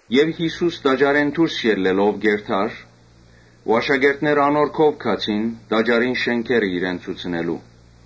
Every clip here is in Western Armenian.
Երբ Յիսուս տաճարէն դուրս ելլելով կ’երթար, աշակերտները անոր քով գացին՝ տաճարին շէնքերը իրեն ցուցնելու։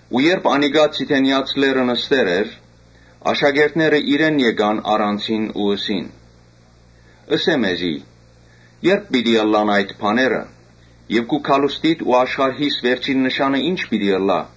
Ու երբոր անիկա Ձիթենեաց լեռը նստեր էր, աշակերտները իրեն գացին առանձին ու ըսին. «Ըսէ մեզի, ե՞րբ պիտի ըլլան այդ բաները եւ քու գալուստիդ ու աշխարհիս վերջին նշանը ի՞նչ պիտի ըլլայ»։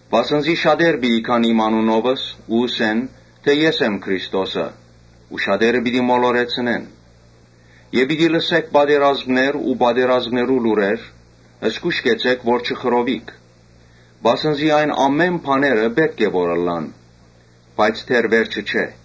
Վասն զի շատեր պիտի գան իմ անունովս ու ըսեն. ‘Ես եմ Քրիստոսը’ ու շատեր պիտի մոլորեցնեն։ Պիտի լսէք պատերազմներ ու պատերազմներու լուրեր։ Զգո՛յշ կեցէք որ չխռովիք, վասն զի այս ամէնը պէտք է որ ըլլան, բայց դեռ վերջը չէ։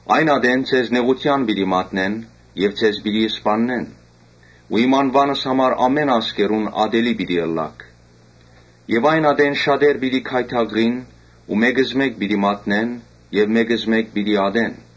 Այն ատեն ձեզ նեղութեան պիտի մատնեն եւ ձեզ պիտի սպաննեն ու իմ անուանս համար բոլոր ազգերուն ատելի պիտի ըլլաք։ Շատեր պիտի գայթակղին ու մէկզմէկ պիտի մատնեն եւ մէկզմէկ պիտի ատեն։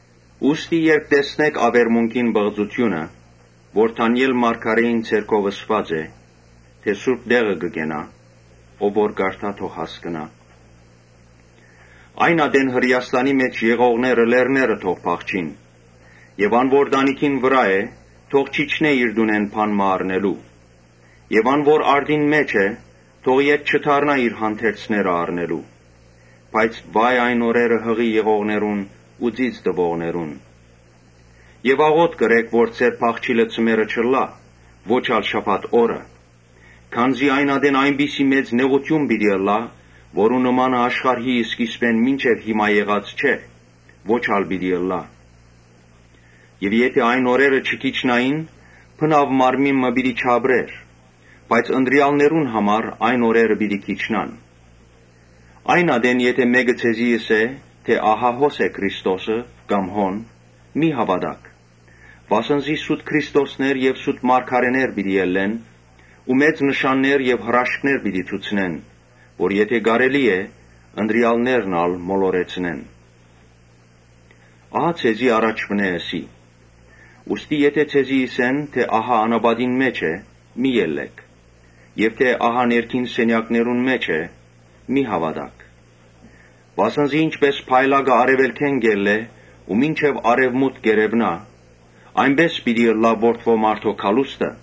«Ուստի երբ տեսնէք աւերմունքին պղծութիւնը՝ որ Դանիէլ մարգարէին միջոցով ըսուած է, թէ սուրբ տեղը կը կենայ (ով որ կարդայ, թող հասկնայ.) Այն ատեն Հրէաստանի մէջ եղողները լեռները թող փախչին։ Ան որ տանիքին վրայ է, թող չիջնէ իր տունէն բան մը առնելու։ Ան որ արտին մէջ է, թող ետ չդառնայ իր հանդերձները առնելու։ Բայց վա՜յ այն օրերը յղի եղողներուն ու ծիծ տուողներուն։ Աղօթք ըրէք որ ձեր փախչիլը ձմեռը չըլլայ, ոչ ալ շաբաթ օրը. Քանզի այն ատեն այնպիսի մեծ նեղութիւն պիտի ըլլայ, որու նմանը աշխարհի սկիզբէն մինչեւ հիմա եղած չէ, ո՛չ ալ պիտի ըլլայ։ Եթէ այն օրերը չքիչնային, բնաւ մարմին մը պիտի չապրէր. բայց ընտրեալներուն համար այն օրերը պիտի քիչնան։ Այն ատեն եթէ մէկը ձեզի ըսէ թէ ‘Ահա հոս է Քրիստոսը կամ հոն’, մի՛ հաւատաք. Վասն զի սուտ Քրիստոսներ ու սուտ մարգարէներ պիտի ելլեն ու մեծ նշաններ ու հրաշքներ պիտի ցուցնեն, որ եթէ կարելի ըլլայ՝ ընտրեալներն ալ մոլորեցնեն։ Ահա ձեզի առաջուընէ ըսի։ Եթէ ձեզի ըսեն թէ ‘Ահա անապատին մէջ է’, մի՛ ելլէք. եւ թէ՝ ‘Ահա ներքին սենեակներուն մէջ է’, մի՛ հաւատաք։ Վասն զի ինչպէս փայլակը արեւելքէն կ’ելլէ ու մինչեւ արեւմուտք կ՛երեւնայ, այնպէս պիտի ըլլայ Որդի մարդոյ գալուստը։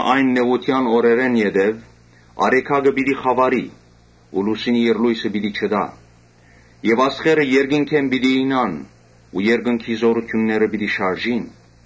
«Այն նեղութեան օրերէն յետոյ արեգակը պիտի խաւարի ու լուսինը իր լոյսը պիտի չտայ, աստղերը երկնքէն պիտի իյնան ու երկնքի զօրութիւնները պիտի շարժին։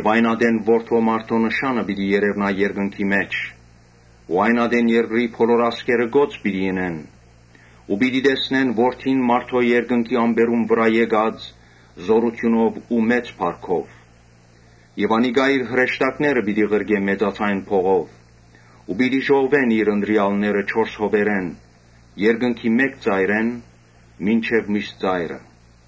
Այն ատեն Որդի մարդոյ նշանը պիտի երեւնայ երկնքի մէջ ու երկրի բոլոր ազգերը կոծ պիտի ընեն եւ պիտի տեսնեն Որդին մարդոյ երկնքի ամպերուն վրայ եկած՝ զօրութիւնով ու մեծ փառքով։ Անիկա իր հրեշտակները պիտի ղրկէ մեծաձայն փողով ու պիտի ժողվեն իր ընտրեալները չորս հովերէն, երկնքի մէկ ծայրէն մինչեւ միւս ծայրը»։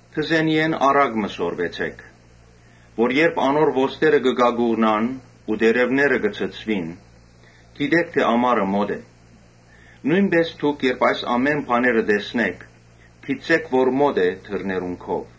«Թզենիէն առակ մը սորվեցէք. որ երբ անոր ոստերը կակուղնան ու տերեւները ցցուին, կը հասկնաք թէ ամառը մօտ է։ Նոյնպէս դուք երբ այս ամէն բաները տեսնէք, գիտցէք թէ մօտ է դռներուն քով։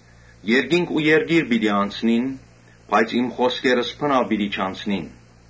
Երկինք ու երկիր պիտի անցնին, բայց իմ խօսքերս բնաւ պիտի չանցնին»։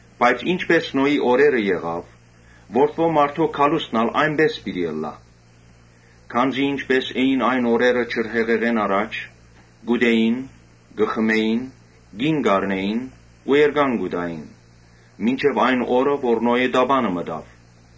Բայց ինչպէս Նոյի օրերը եղաւ, Որդի մարդոյ գալուստն ալ այնպէս պիտի ըլլայ։ Քանզի ինչպէս էին այն օրերը ջրհեղեղէն առաջ՝ կ’ուտէին, կը խմէին, կին կ’առնէին ու էրկան կու տային՝ մինչեւ այն օրը երբ Նոյ տապանը մտաւ,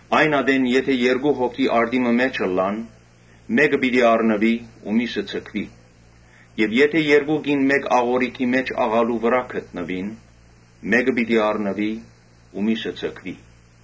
Այն ատեն եթէ երկու հոգի արտի մը մէջ ըլլան, մէկը պիտի առնուի ու միւսը ձգուի. Եւ եթէ երկու կին մէկ աղօրիքով աղալու վրայ գտնուին, մէկը պիտի առնուի ու միւսը ձգուի։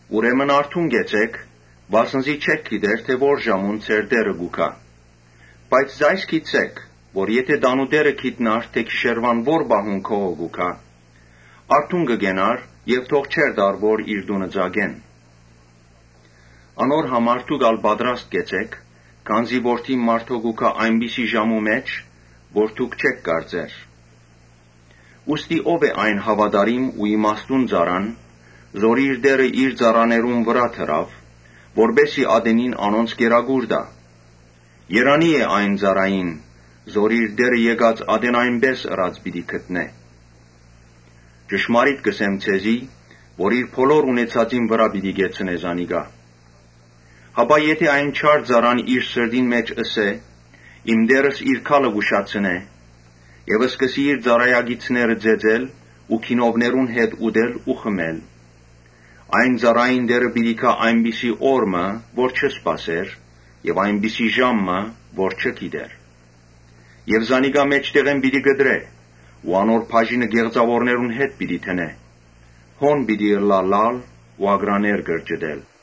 «Ուրեմն արթուն կեցէք, վասն զի չէք գիտեր թէ որ ժամուն ձեր Տէրը պիտի գայ։ Բայց այս գիտցէք, թէ եթէ տանտէրը գիտնար թէ գիշերուան որ պահուն գողը կու գայ, արթուն կը կենար եւ թող չէր տար որ իր տունը ծակեն։ Անոր համար դուք ալ պատրաստ կեցէք, քանզի Որդին մարդոյ պիտի գայ այնպիսի ժամու մը որ դուք չէք կարծեր»։ «Ո՞վ է այն հաւատարիմ ու իմաստուն ծառան՝ որ իր տէրը իր ծառաներուն վրայ դրաւ, որպէս զի ատենին անոնց կերակուր տայ։ Երանի՜ է այն ծառային, որ իր տէրը եկած ատեն պիտի տեսնէ թէ այնպէս ըրած է։ Ճշմարիտ կ’ըսեմ ձեզի որ իր բոլոր ունեցածին վրայ պիտի կեցնէ զանիկա։ Հապա եթէ այն չար ծառան իր սրտին մէջ ըսէ, ‘Իմ տէրս իր գալը կ’ուշացնէ’, Եւ սկսի իր ծառայակիցները ծեծել ու գինովներուն հետ ուտել ու խմել։ Այն ծառային տէրը պիտի գայ այնպիսի օր մը որ չի սպասեր եւ այնպիսի ժամու մը՝ որ չի գիտեր Եւ զանիկա մէջտեղէն պիտի կտրէ ու անոր բաժինը կեղծաւորներուն հետ պիտի դնէ։ Հոն պիտի ըլլայ լալ ու ակռաներ կրճտել»։